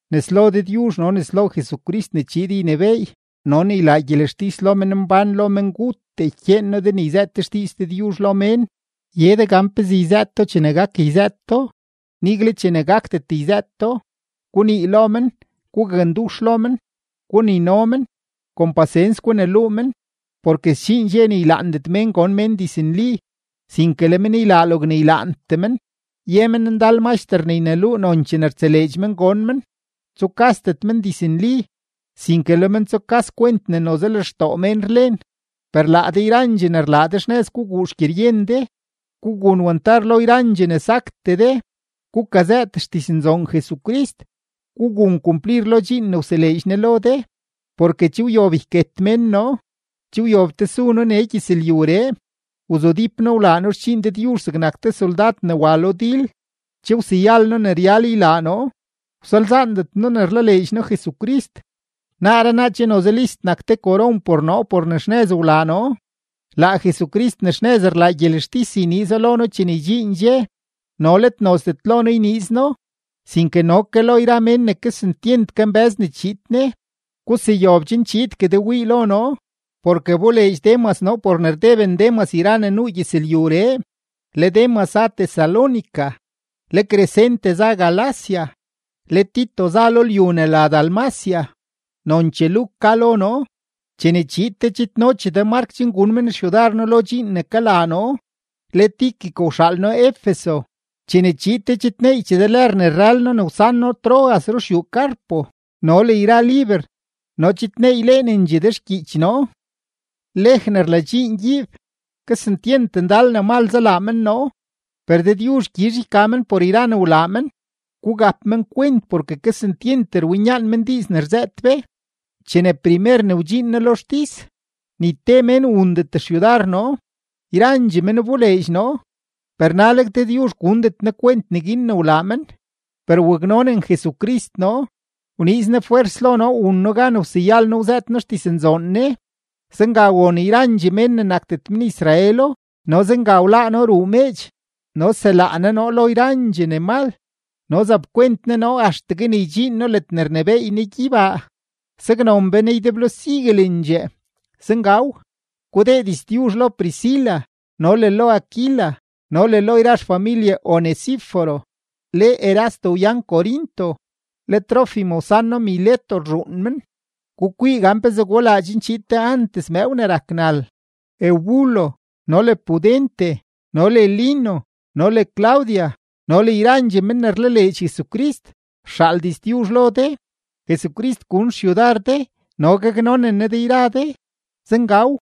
Nes lo Dëdyuzh no nes lo Jesucrist ne chiid ynebééy no ne ylaa gyelextis lo menmbán lo menguttee, ykyeen noo de ne yzëët de xdiiz Dëdyuzh lo mén, ye de gan pezee yzëët do chene gak yzëët do, nigle chene gakdet yzëët do. Gunii lo men, gugakndux lo men, gunino men, kon pasens guneluu men. Porke sdxiin dxe ne ylaandet mén gon men diznli, sinke le men ylaa logne ylaantee men, ye men ndal maxter ne yneluu nonchee ne rtseleedx men gon men. Tsukasdet men diznli, sinke le men tsukas kwent ne noze lextoo mén rlen. Per laa de yrandxee ne rlaa de, xnëz guguu xgyeryen de, gugun wantar lo yrandxee ne saktee de, gukazëët xdiznzoon Jesucrist, gugun kumplir lo dxiin ne wseleedx Ne lo de. Porke che wyob yket mén noo, che wyob tesu noo nee gyëzlyuree. Wzudíp noo wlaa noo xdxiin Dëdyuzh zegnak te soldad ne wa lo dil, che wseyal noo ne ryal ylaa noo, wsalzaandet noo ne rlaleedx noo Jesucrist. Naaree naa che noze list nak te koron por noo por ne xnëz wlaa noo; laa Jesucrist ne xnëz rlaa gyelextis yniizo lo noo chene ydxiin dxe, no let nozdet lo noo yniiz No, sinke no lo yra mén ne kesentyent kambë́z ne chiid Ne. Guseyob chen chiidgue de wii lo noo, porke wboleedx Demas noo por ne rdeben Demas yra ne nuu gyëzlyuree; le Demas za Tesalónica, le Crescente za Galacia, le Tito za lo lyu ne la Dalmacia, nonchee Luk ka lo noo. Chene chiid de chidnochee de Mark chen gun men xyudar noo lo dxiin ne kalaa noo. Le Tíquico wxaal noo Efeso. Chene chiid de chidneeychee de lër ne rrël noo ne wsan noo Troas ruxyuu Carpo no le yra liber no chidneyleenendxee de xgyiich noo. Lej ne rladxiin gyiib, kesentyent ndal ne mal zalaa men noo, per Dëdyuzh gyizh yka men por yra ne wlaa men. Gugap men kwent porke kesentyent rwinyaan men diiz ne rzëët be. Chene primer ne wdxiin noo lo xtis, ni te mén wundet xyudar noo, yrandxee men wboleedx noo, per naleg Dëdyuzh gundet Ne kwent neguin ne wlaa men. Per waknonen Jesucrist noo, wniiz Ne fwers lo noo wun noo gan wseyal noo wzëët noo xdiznzoon Ne. Zenga won yrandxee mén ne nakdet men-Israelo no zenga wláá noo ruu meedx. No selaa Ne noo lo yrandxee ne mal no zapkwent Ne noo axtegue ne ydxiin noo ledne rnebééy Ne gyeybaa. Saknon be Ne ydeblo siguelendxee. Zengaw. Gudee diztyuzh lo Priscila no le lo Aquila no le lo yra xfamilye Onesíforo. Le Erasto wyan Corinto, le Trófimo wsan noo Mileto rzhuun men. Gukwii gan pezee gulaa chen chiid de antes mëëw ne rak nal. Eubulo no le Pudente no le Lino no le Claudia no le yrandxee men ne rlaleedx Jesucrist rxaal diztyuzh lo de. Jesucrist gun xyudar de no gaknonen Ne de yra de. Zengaw.